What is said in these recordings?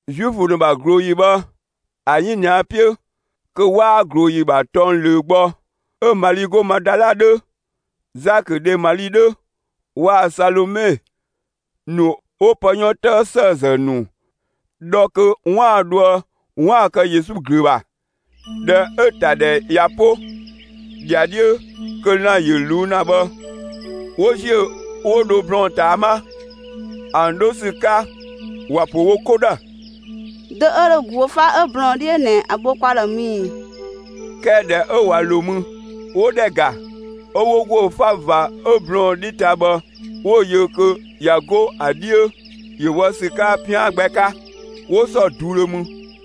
Zuifö ‑nu ‑bha ꞊glooyi bhë, ‑a 'yinia 'piö (kö 'waa ꞊glooyi ‑bha tɔng ꞊löö gbɔ), 'ö Mali 'go Madala 'dhö, Zakö dhe Mali 'dhö, waa‑ Salome ‑nu 'wo pë 'yɔn 'tëë ‑sëëzë ‑nu dhɔ kö 'waan‑ dhoë 'waan‑ kë Yesu ꞊glöö ‑bha. ꞊Dhɛ 'ö‑ ‑ta ‑dhɛ ꞊ya 'po, ‑dhiadhiö kö lan‑ ‑yö ꞊luu'‑ ‑na bhë, 'wo ‑ziö 'wo dho blɔɔn‑ ꞊taa 'ma. ‑An 'dho ‑sü 'ka, ‑wa ‑pö wo 'ko ‑dhë: «Dö 'ö dho ‑guö 'fa 'ö blɔɔn‑ 'dhiö ꞊nɛ, ‑a bho kwa ‑dhë mü ꞊i?» 'Kɛɛ ꞊dhɛ 'ö ꞊wa ‑lo mü, 'wo ‑dhɛ ‑ga, 'ö 'wo ‑guö 'fa ꞊va 'ö blɔɔn‑ 'dhi ta bhë, 'wo‑ yö kö ꞊ya 'go ‑a 'dhiö, ‑yö wɔ ‑sü 'ka 'pian gbɛ 'ka. 'Wo ‑sɔ ꞊duudhö mü;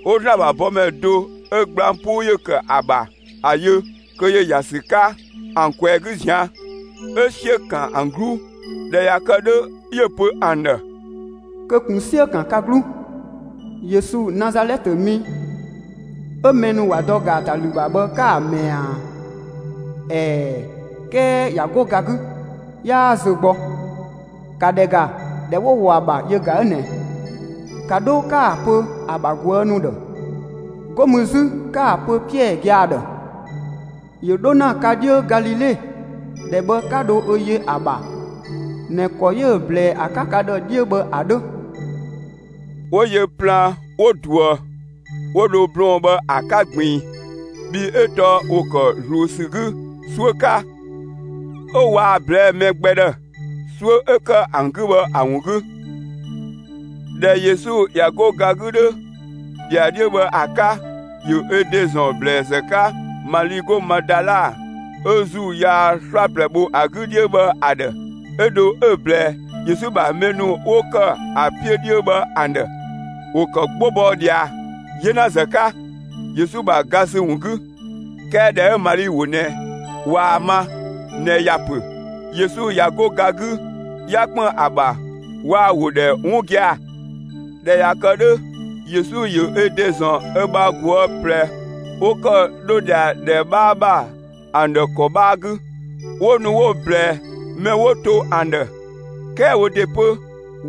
'wo ‑Zlan ‑bha bɔmɛ do 'ö gblang 'puu ‑yö ‑kë ‑a ‑bha, ‑a yö kö ‑yö ‑ya ‑sü 'ka ‑an ꞊kwɛɛ‑ 'gü ꞊zian'. 'Ö 'siö‑ ‑kan ‑an 'gluu. ꞊Dhɛ ꞊ya kë 'dhö, 'yö‑ pö ‑an ‑dhë: «Kö ꞊kun 'siö‑ ‑kan ka 'gluu! Yesu, Nazalɛtë mi 'ö mɛ ‑nu ‑wa dɔ ‑gaatalü ‑bha bhë 'ka‑ ꞊mɛɛ ꞊a? ꞊Ɛɛ, 'kɛɛ ꞊ya 'go ga 'gü, 'yaa zö gbɔ. ‑Ka ‑dhɛ ‑ga, ‑dhɛ 'wo‑ ‑wɔ ‑a ‑bha yö ꞊ga ꞊nɛ! ‑Ka 'dho 'ka‑ pö ‑a ‑bha ꞊guë' ‑nu ‑dhë, 'go mü 'zü, 'ka‑ pö Piɛɛ gia‑ ‑dhë: ‑Yö 'dho ‑na ka 'dhiö Galile, ‑dhɛ bhë 'ka dho ö yö ‑a ‑bha ꞊nɛ ‑kɔ 'yö‑ ꞊blɛɛ ‑a 'ka ka ‑dhë 'dhiö bhë ‑a 'dhö.» 'Wo yö plaan 'wo ꞊duë, 'wo dho blɔɔn‑ bhë ‑a 'ka ꞊gbiin. Bhii 'ö tɔɔ ‑wo ‑kë ꞊zluun ‑sü 'gü 'suö 'ka, 'ö waa‑ ꞊blɛɛ'‑ mɛ gbɛ ‑dhë, 'suö 'ö ‑kë ‑an 'gü bhë ‑a ‑wun 'gü. [꞊Dhɛ Yesu ꞊ya 'go ga 'gü 'dhö, ‑dhiadhiö bhë ‑a 'ka, ‑yö ö ‑de ‑zɔn ‑blɛɛzë 'ka Mali 'go Madala, 'ö ‑zuu yaa 'slaplɛ bho ‑a 'gü 'dhiö bhë ‑a ‑dhë. 'Ö dho 'ö‑ ꞊blɛɛ Yesu ‑bha mɛ ‑nu 'wo ‑kë ‑a 'piö 'dhiö bhë ‑an ‑dhë. ‑Wo ‑kë 'gbo bɔ ꞊dhia 'yenazë 'ka, Yesu ‑bha ga ‑sü ‑wun 'gü. 'Kɛɛ ꞊dhɛ 'ö Mali ‑wo ꞊nɛ ꞊waa‑ ma ꞊nɛ ‑ya ‑pö «Yesu ꞊ya 'go ga 'gü 'ya ‑kpën ‑a ‑bha» waa‑ ‑wo ‑dhɛ 'wun gia‑. ꞊Dhɛ ꞊ya kë 'dhö, Yesu ‑yö ö ‑de ‑zɔn ö bha ꞊guë' ꞊plɛ 'wo ‑kë 'dho ꞊dhia ‑dhɛ 'bhaa ‑bha ‑an ‑dhë ‑kɔ 'bhaa 'gü. 'Wo nu 'wo‑ ꞊blɛɛ mɛ 'wo to ‑an ‑dhë, 'kɛɛ wo ‑de 'pö,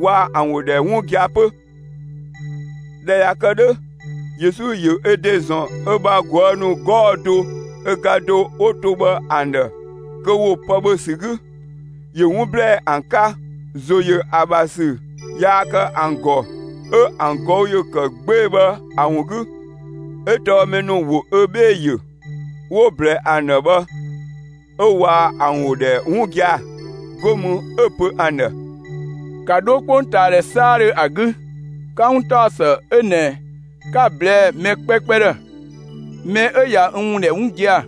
waa ‑an ‑wo ‑dhɛ 'wun gia‑ 'pö. ꞊Dhɛ ꞊ya kë 'dhö, Yesu ‑yö ö ‑de ‑zɔn ö bha ꞊guë' ‑nu 'gɔɔ‑ do ö ga do 'wo to bhë ‑an ‑dhë kö ‑wo pë ‑bhö ‑sü 'gü. ‑Yö 'wun ‑blɛɛ ‑an 'ka, ‑zo yö ö ‑bha ‑sü yaa kë ‑an ‑gɔ, 'ö ‑an ꞊gɔü' ‑yö ‑kë 'gbee‑ bhë ‑a ‑wun 'gü, 'ö tɔɔ mɛ ‑nu ‑wo ö 'bhee‑ ‑yö, 'wo‑ ꞊blɛɛ ‑an ‑dhë bhë 'ö waa ‑an ‑wo ‑dhɛ 'wun gia‑. 'Go mü 'ö‑ pö ‑an ‑dhë: «‑Ka 'dho 'kpongtaadhɛ 'saadhö ‑a 'gü, 'ka 'wuntaɔsë 'ö ꞊nɛ 'ka‑ ꞊blɛɛ'‑ mɛ 'kpɛkpɛ ‑dhë! Mɛ 'ö ꞊ya n ‑wun ‑dhɛ 'wun gia‑,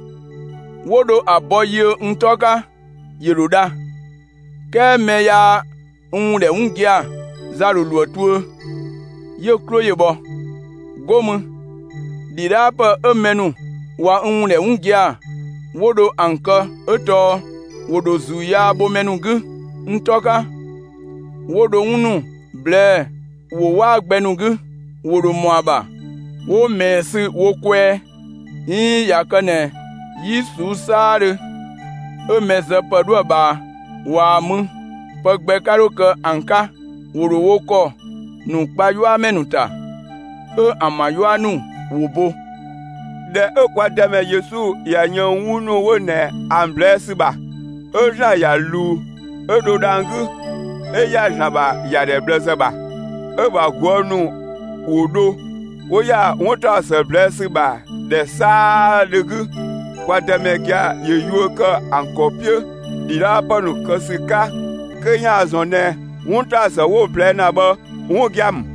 'wo dho ‑a bɔ yiö n 'tɔ 'ka, ‑yö ‑dho dha; 'kɛɛ mɛ yaa n ‑wun ‑dhɛ 'wun gia‑, za ‑dho ‑lo ‑a tuö, 'yö‑ 'klo ‑yö bhɔ. 'Go mü ‑dhidhaapë 'ö mɛ ‑nu ꞊wa n ‑wun ‑dhɛ 'wun gia‑, 'wo dho ‑an kë 'ö tɔɔ: ‑Wo ‑dho ‑zuu yaa bho mɛ ‑nu 'gü n 'tɔ 'ka, 'wo dho 'wun ‑nu ꞊blɛɛ'‑ ‑wo 'waa gbɛ ‑nu 'gü. ‑Wo ‑dho ‑mɔ ‑a ‑bha 'wo ꞊mɛɛ sü wo kwɛɛ, 'iin ꞊ya kë ꞊nɛ 'yi ꞊suu'‑ 'saadhö 'ö mɛ zë ‑pë 'dhö ‑a ꞊bhaa, ꞊waa‑ mü, pë gbɛ 'ka 'dho kë ‑an 'ka; ‑wo ‑dho wo ‑kɔ ‑nu kpa 'yuamɛ ‑nu ‑ta, 'ö ‑an ‑bha 'yua ‑nu ‑wo bo.» ꞊Dhɛ 'ö kwa Dëmɛ Yesu ꞊ya yën 'wun ‑nu 'wo ꞊nɛ ‑an ꞊blɛɛ' ‑sü ‑bha, 'ö ‑Zlan ‑ya ꞊luu, 'ö dho dhang‑ 'gü, 'ö ‑ya ‑Zlan ‑bha ‑yadhɛ ꞊bhlëzë ‑bha. 'Ö‑ ‑bha ꞊guë' ‑nu ‑wo dho, 'wo ‑ya 'wuntaɔsë ꞊blɛɛ' ‑sü ‑bha ‑dhɛ 'saadhö 'gü. Kwa Dëmɛ gia‑ ‑yö yuö ‑kë ‑an ‑kɔ 'piö ‑dhidhaapë ‑nu kë ‑sü 'ka kö ‑yaan ‑zɔn ꞊nɛ 'wuntaɔsë 'wo‑ ꞊blɛɛ' ‑na bhë 'wun gia‑ ‑mü.]